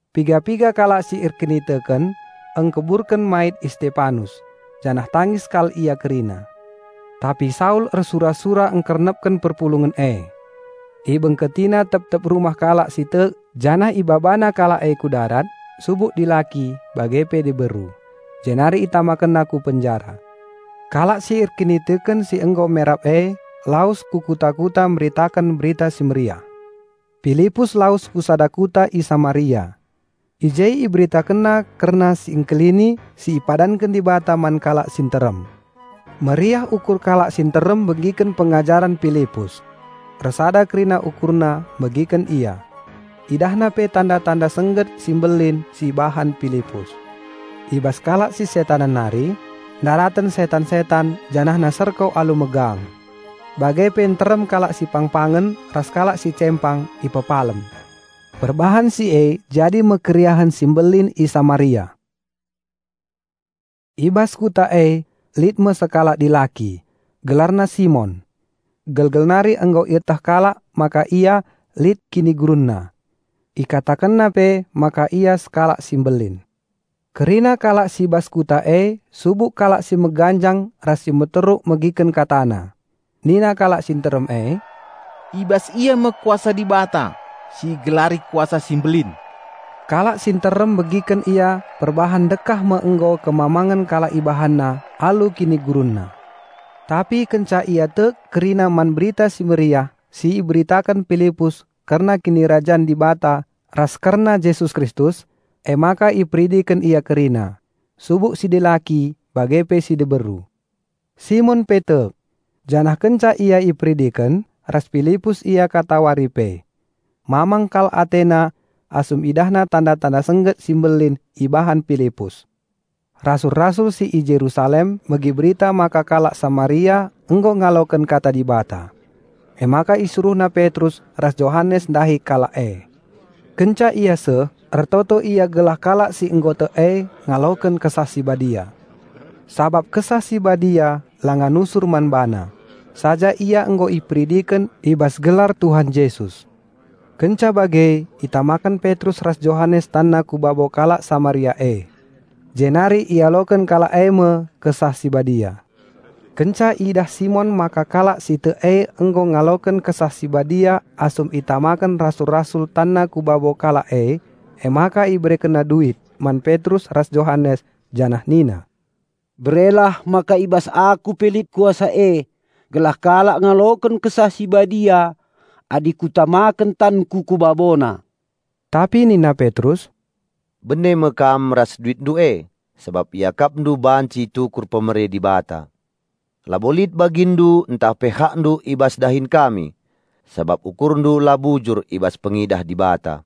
Piga-piga kalak si erkiniteken, engkuburken mait Istepanus, janah tangis kal ia kerina. Tapi Saul ersura-sura engkernepken perpulungen e. Ibengketina tep-tep rumah kalak si tek janah ibabana kalak e ku darat subuk dilaki bage pe diberu. Jenari itamakenna ku penjara. Kalak si erkiniteken si nggo merap e lawes ku kuta-kuta meritaken Berita Si Mehuli. Pilipus lawes ku sada kuta i Samaria. I je iberitakenna kerna Si Engkelini si ipadanken Dibata man kalak si nterem. Meriah ukur kalak si nterem megiken pengajaren Pilipus. Ersada kerina ukurna megiken ia. Idahna pe tanda-tanda sengget si mbelin si ibahan Pilipus. I bas kalak si setanen nari, ndaraten setan-setan janahna serko alu megang. Bage pe nterem kalak si pangpangen ras kalak si cempang ipepalem. Perbahan si e jadi me keriahen si mbelin i Samaria. I bas kuta e lit me sekalak dilaki; gelarna Simon. Gelgel nari nggo ieteh kalak maka ia lit kinigurunna. Ikatakenna pe maka ia sekalak si mbelin. Kerina kalak si i bas kuta e, subuk kalak si meganjang ras si meteruk megiken katana. Nina kalak si nterem e, "I bas ia me Kuasa Dibata si igelari Kuasa si Mbelin." Kalak si nterem megiken ia perbahan ndekah me nggo kemamangen kalak ibahanna alu kinigurunna. Tapi kenca ia tek kerina man Berita Si Mehuli si iberitaken Pilipus kerna Kinirajan Dibata ras kerna Jesus Kristus, emaka iperidiken ia kerina, subuk si dilaki bage pe si diberu. Simon pe tek. Janah kenca ia iperidiken, ras Pilipus ia katawari pe. Mamang kal atena asum idahna tanda-tanda sengget si mbelin ibahan Pilipus. Rasul-rasul si i Jerusalem megi berita maka kalak Samaria nggo ngaloken kata Dibata. Emaka isuruhna Petrus ras Johanes ndahi kalak e. Kenca ia seh, ertoto ia gelah kalak si nggo tek e ngaloken Kesah Si Badia. Sabap Kesah Si Badia langa nusur man bana; saja ia nggo iperidiken i bas gelar Tuhan Jesus. Kenca bage itamaken Petrus ras Johanes tanna ku babo kalak Samaria e, jenari ialoken kalak eme Kesah Si Badia. Kenca idah Simon maka kalak si tek e nggo ngaloken Kesah Si Badia asum itamaken rasul-rasul tanna ku babo kalak e, emaka iberekenna duit man Petrus ras Johanes, janah nina, "Berelah maka i bas aku pe lit kuasa e, gelah kalak ngaloken Kesah Si Badia adi kutamaken tanku ku babona." Tapi nina Petrus, "Bene me kam ras duitndu e, sabap iakapndu banci itukur pemere Dibata. Labo lit baginndu ntah pe hakndu i bas dahin kami, sabap ukurndu la bujur i bas pengidah Dibata.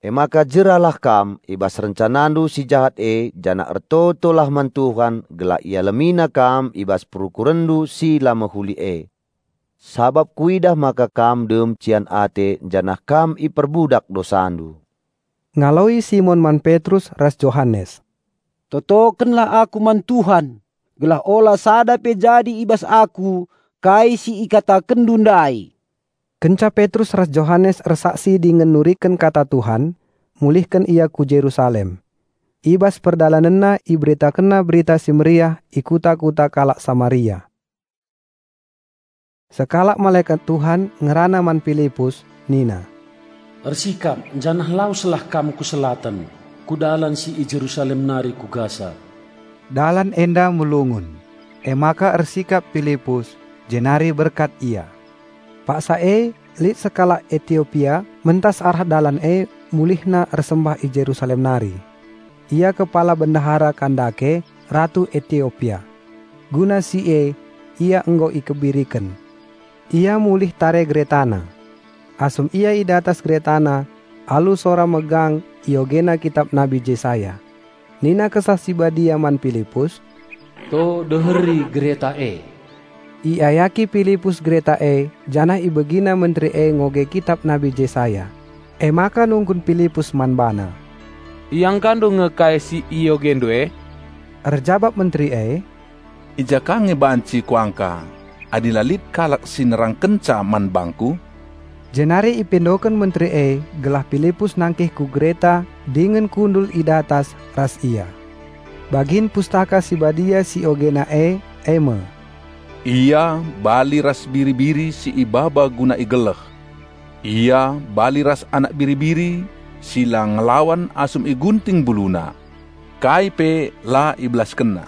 Emaka jeralah kam i bas rencanandu si jahat e janah ertotolah man Tuhan gelah IalemiNandu i bas perukurenndu si la mehuli e. Sabap kuidah maka kam dem cian ate janah kam iperbudak dosandu." Ngaloi Simon man Petrus ras Johanes, "Totokenlah aku man Tuhan gelah ula sada pe jadi i bas aku kai si ikatakenndu ndai." Kenca Petrus ras Johanes ersaksi dingen nuriken kata Tuhan, mulihken ia ku Jerusalem. I bas perdalanenna iberitakenna Berita Si Mehuli i kuta-kuta kalak Samaria. Sekalak malekat Tuhan, ngerana man Pilipus nina, "Ersikap janah laweslah kam ku Selatan, ku dalan si i Jerusalem nari ku Gasa." (Dalan enda melungun). Emaka ersikap Pilipus, jenari berkat ia. Paksa e lit sekalak Etiopia mentas arah dalan e mulihna ersembah i Jerusalem nari. Ia kepala Bendahara Kandake, Ratu Etiopia. Guna si e ia nggo ikebiriken. Ia mulih tare geretana. Asum ia i datas geretana alu sora megang iogena kitap Nabi Jesaya. Nina Kesah Si Badia man Pilipus, "To deheri gereta e." Iayaki Pilipus gereta e janah ibegina menteri e ngoge kitap Nabi Jesaya. Emaka nungkun Pilipus man bana, "Iangkandu nge kai si iogendu e?" Erjabap menteri e, "I ja ka nge banci kuangka, adi la lit kalak si nerangkenca man bangku?" Jenari ipindoken menteri e gelah Pilipus nangkih ku gereta dingen kundul i datas ras ia. Bagin Pustaka Si Badia si iogena e eme, 'Ia bali ras biri-biri si ibaba guna igeleh. Ia bali ras anak biri-biri si la ngelawan asum igunting mbuluna. Kai pe la IbelaskenNa.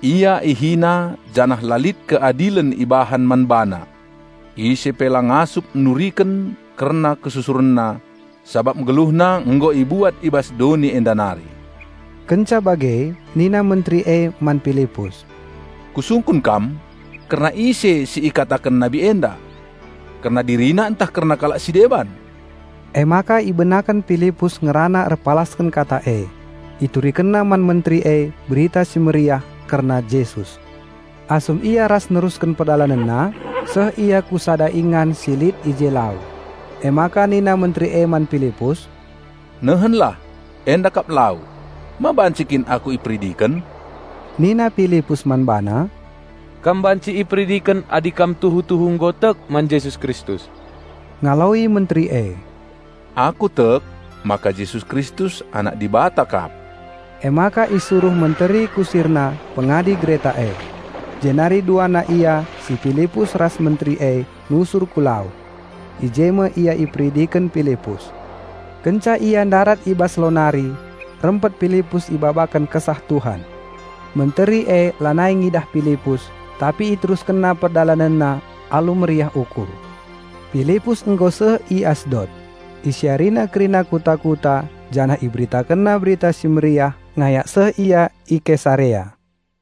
Ia ihina janah la lit keadilen ibahan man BaNa. Ise pe la ngasup nuriken kerna KesusurenNa, Sabap GeluhNa nggo ibuat i bas doni enda nari.' Kenca bage nina menteri e man Pilipus, "Kusungkun kam: Kerna ise si ikataken nabi enda? Kerna dirina ntah kerna kalak si deban?" Emaka ibenaken Pilipus ngerana erpalasken kata e. Iturikenna man menteri e Berita Si Mehuli kerna Jesus. Asum ia ras nerusken perdalanenna, seh ia ku sada ingan si lit i je lau. Emaka nina menteri e man Pilipus, "Nehenlah, enda kap lau. Ma banci kin aku iperidiken?" (Nina Pilipus man bana, "Kam banci iperidiken adi kam tuhu-tuhu nggo tek man Jesus Kristus." Ngaloi menteri e, "Aku tek maka Jesus Kristus Anak Dibata kap.") Emaka isuruh menteri kusirna pengadi gereta e. Jenari duana ia, si Pilipus ras menteri e, nusur ku lau. I je me ia iperidiken Pilipus. Kenca ia ndarat i bas lau nari, rempet Pilipus ibabaken Kesah Tuhan. Menteri e lanai ngidah Pilipus, tapi iteruskenna perdalanenna alu meriah ukur. Pilipus nggo seh i Asdot. Isiarina kerina kuta-kuta janah iberitakenna Berita Si Mehuli ngayak seh ia i Kesarea.